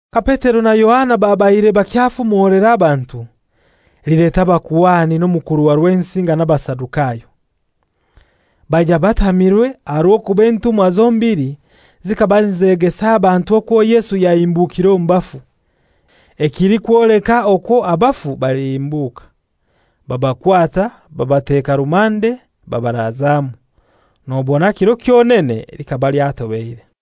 Ka Petero na Yohana babaire bakyafumolera abantu, lileta abakuhani n'omukuru wa Rwensinga n'Abasadukayo. Baija batamirwe aha rw'okuba entumwa zombili zikaba nizegesa abantu okwo Yesu yahimbukire omu bafu, ekilikwoleka okwo abafu balihimbuka. Babakwata babateka rumande babarazamu, nobona kiro kyonene likaba lyatobeire.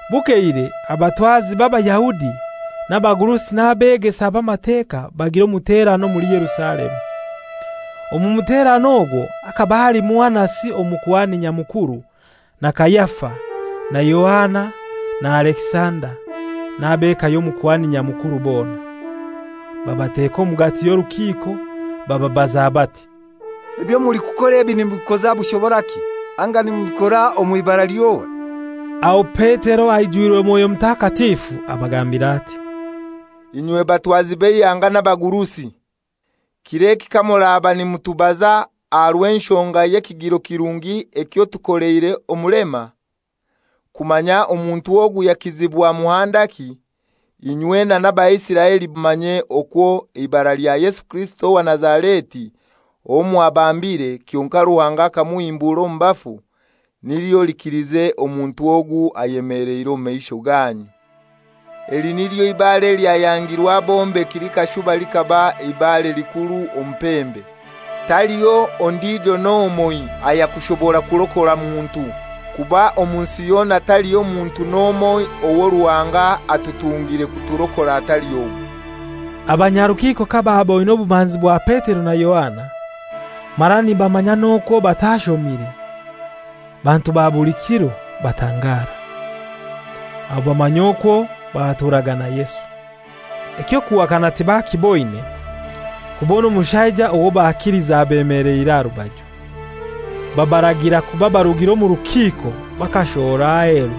Bukeire abatwazi b'Abayahudi n'abagurusi n'Abeegesa b'Amateka bagira omuterano omuli Yerusalemu. Omu muterano ogwo hakaba halimu Anasi Omukuhani Nyamukuru, na Kayafa, na Yohana na Alekisanda, n'ab'eka y'Omukuhani Nyamukuru bona. Babateka omugati y'orukiiko bababaza bati, «Ebyo mulikukora ebi nimubikoza bushoboraki, anga nimubikora omw'ibara ly'ohai?» Aho Petero aijwirwe Mwoyo Mutakatifu abagambira ati, «Inywe batwazi b'eihanga n'abagurusi, kir'eki kamuraba nimutubaza aha rw'enshonga y'ekigiro kirungi ekyo tukoleire omulema, kumanya omuntu ogu yakizibwa muhandaki, inywena n'Abaisiraeli bona mumanye okwo eibara lya Yesu Kirisito owa Nazareti, owo mwabambire, kyonkai Ruhanga akamuhimbura omu bafu, nilyo likilize omuntu ogu ayemeleire omu maisho ganyu. Eli nilyo ibaare elyayangirwe abombeki likashuba likaba ibare likuru omu pembe. Taliho ondijo n'omoi ayakushobora kurokora muntu, kuba omu nsi yona taliho muntu n'omoi owo Ruhanga atutungire kuturokora atali ogu.» Abanyarukiiko kabaaboine obumanzi bwa Petero na Yohana, mara nibamanya n'okwo batashomire, bantu ba buli kiro, batangara. Aho bamanya okwo baturaga na Yesu. Eky'okuhakana tibakiboine, kubona omushaija owo bakilize abemeleire aha rubaju. Babaragira kuba barugire omu rukiiko bakashohora aheru,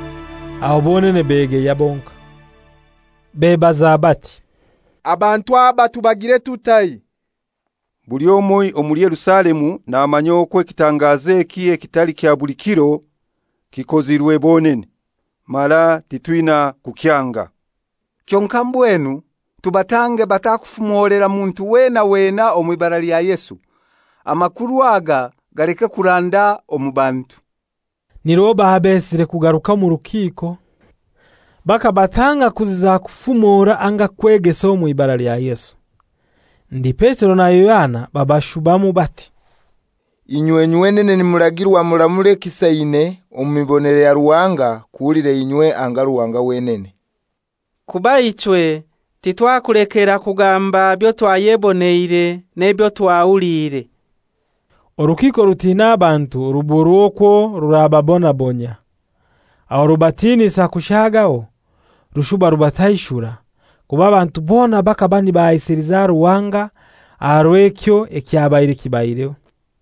aho bonene begeya bonkai. Bebaza bati, «Abantu aba tubagiire tutai? Buli omoi omuli Yerusalemu namanya okwo ekitangazo eki ekitali kya buli kiro kikozirwe bonene, mara titwina kukyanga. Kyonkai mbwenu tubatange batakufumolera muntu weena weena omw'ibara lya Yesu, amakuru aga galeke kuranda omu bantu.» Nirwo babesire kugaruka omu rukiiko bakabatanga kutaziza kufumora anga kwegesa mw'ibara lya Yesu. Ndi Petero na Yohana babashubamu bati, «Inywe nywenene nimuragirwa muramure ekisaine omu mibonere ya Ruhanga, kuhulira inywe anga Ruhanga wenene. Kuba ichwe titwakulekera kugamba byo twayeboneire n'ebyo twahuliire.» Orukiiko rutina abantu ruburwa okwo rurababonabonyia; aho rubatinisa kushaagaho rushuba rubataishura, kuba abantu bona bakaba nibahaisiliza Ruhanga aha rw'ekyo ekyabaire kibaireho.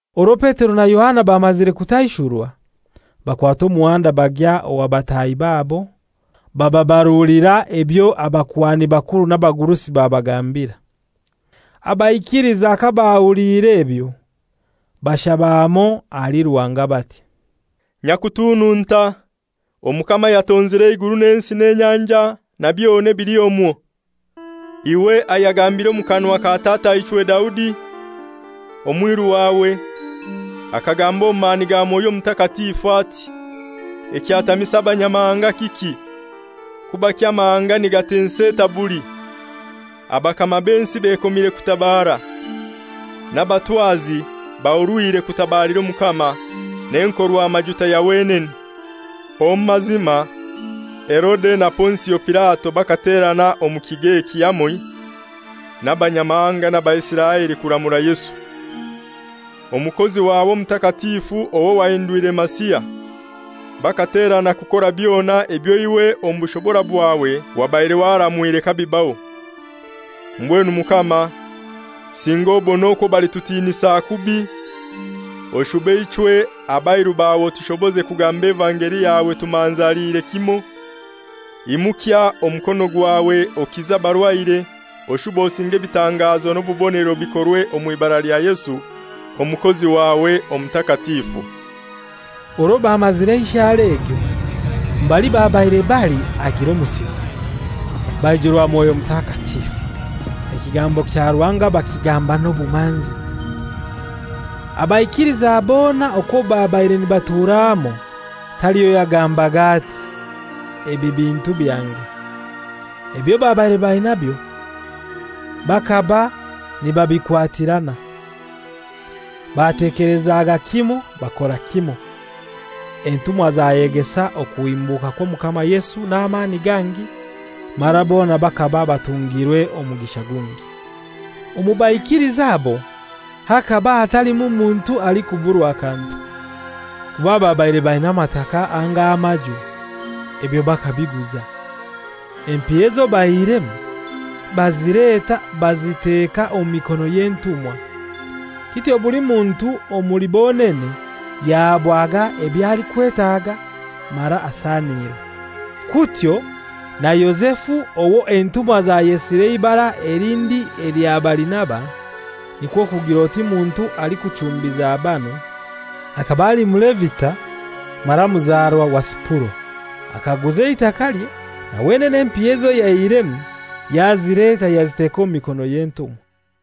Orwo Petero na Yohana bamazire kutaishurwa, bakwata omuhanda bagya owa bataahi babo bababarulira ebyo abakuhani bakuru n'abagurusi babagambira. Abaikiliza kabahuliire ebyo, bashaba hamoi ahali Ruhanga bati, «Nyakutununta Omukama ayatonzire eiguru n'ensi n'enyanja na byona ebili omwo, iwe ayagambiire omu kanwa ka tataichwe Daudi, omwiru wawe, akagamba omu mani ga Mwoyo Mutakatifu ati, ‹Ekyatamisa Abanyamahanga kiki; kubaki amahanga nigatensa etabuli? Abakama b'ensi bekomire kutabaara, n'abatwazi bahurwire kutabalira Omukama n'Enkorwamajuta ya wenene.› Omu mazima Herode na Ponsio Pilato bakaterana omu kigo eki hamoi n'Abanyamahanga n'Abaisiraeli kuramura Yesu, Omukozi wawe Omutakatifu, owo wahindwire Masiha. Bakaterana kukora byona ebyo iwe omu bushobora bwawe wabaire waramwire kabibaho. Mbwenu Mukama, singa obone okwo balitutinisa kubi, oshube ichwe abairu bawe otushoboze kugamba evangeli yawe tumanzaliire kimoi. Imukya omukono gwawe okize abarwaire, oshube osinge ebitangazo n'obubonero bikorwe omw'ibara lya Yesu Omukozi wawe Omutakatifu.» Orwo bamazire enshara egyo, mbali babaire bali hagira omusisi; baijurwa Mwoyo Mutakatifu; ekigambo kya Ruhanga bakigamba n'obumanzi. Abaikiliza bona okwo babaire nibatura hamoi, taliho yagambaga ati, «Ebi bintu byange.» Ebyo babaire bainabyo bakaba nibabikwatirana. Batekelezaga kimoi bakora kimoi. Entumwa zayegesa okuhimbuka kw'Omukama Yesu n'amani gangi, mara bona bakaba batungirwe omugisha gungi. Omu baikiliza abo hakaba hatalimu muntu alikuburwa kantu. Kuba ababaire baina amataka anga amaju, ebyo bakabiguza. Empiya ezo baihiremu bazileta baziteka omu mikono y'entumwa; kityo buli muntu omuli bonene yahabwaga ebyo alikwetaga mara asanirwa. Kutyo na Yozefu owo entumwa zayesire eibara elindi elya Barinaba, (nikwo kugir'oti Muntu alikuchumbiza banu), akaba ali Mulevita mara muzarwa wa Sipuro, akaguza eitakalye, na wenene empiha ezo yaihiremu yazileta yaziteka omu mikono y'entumwa.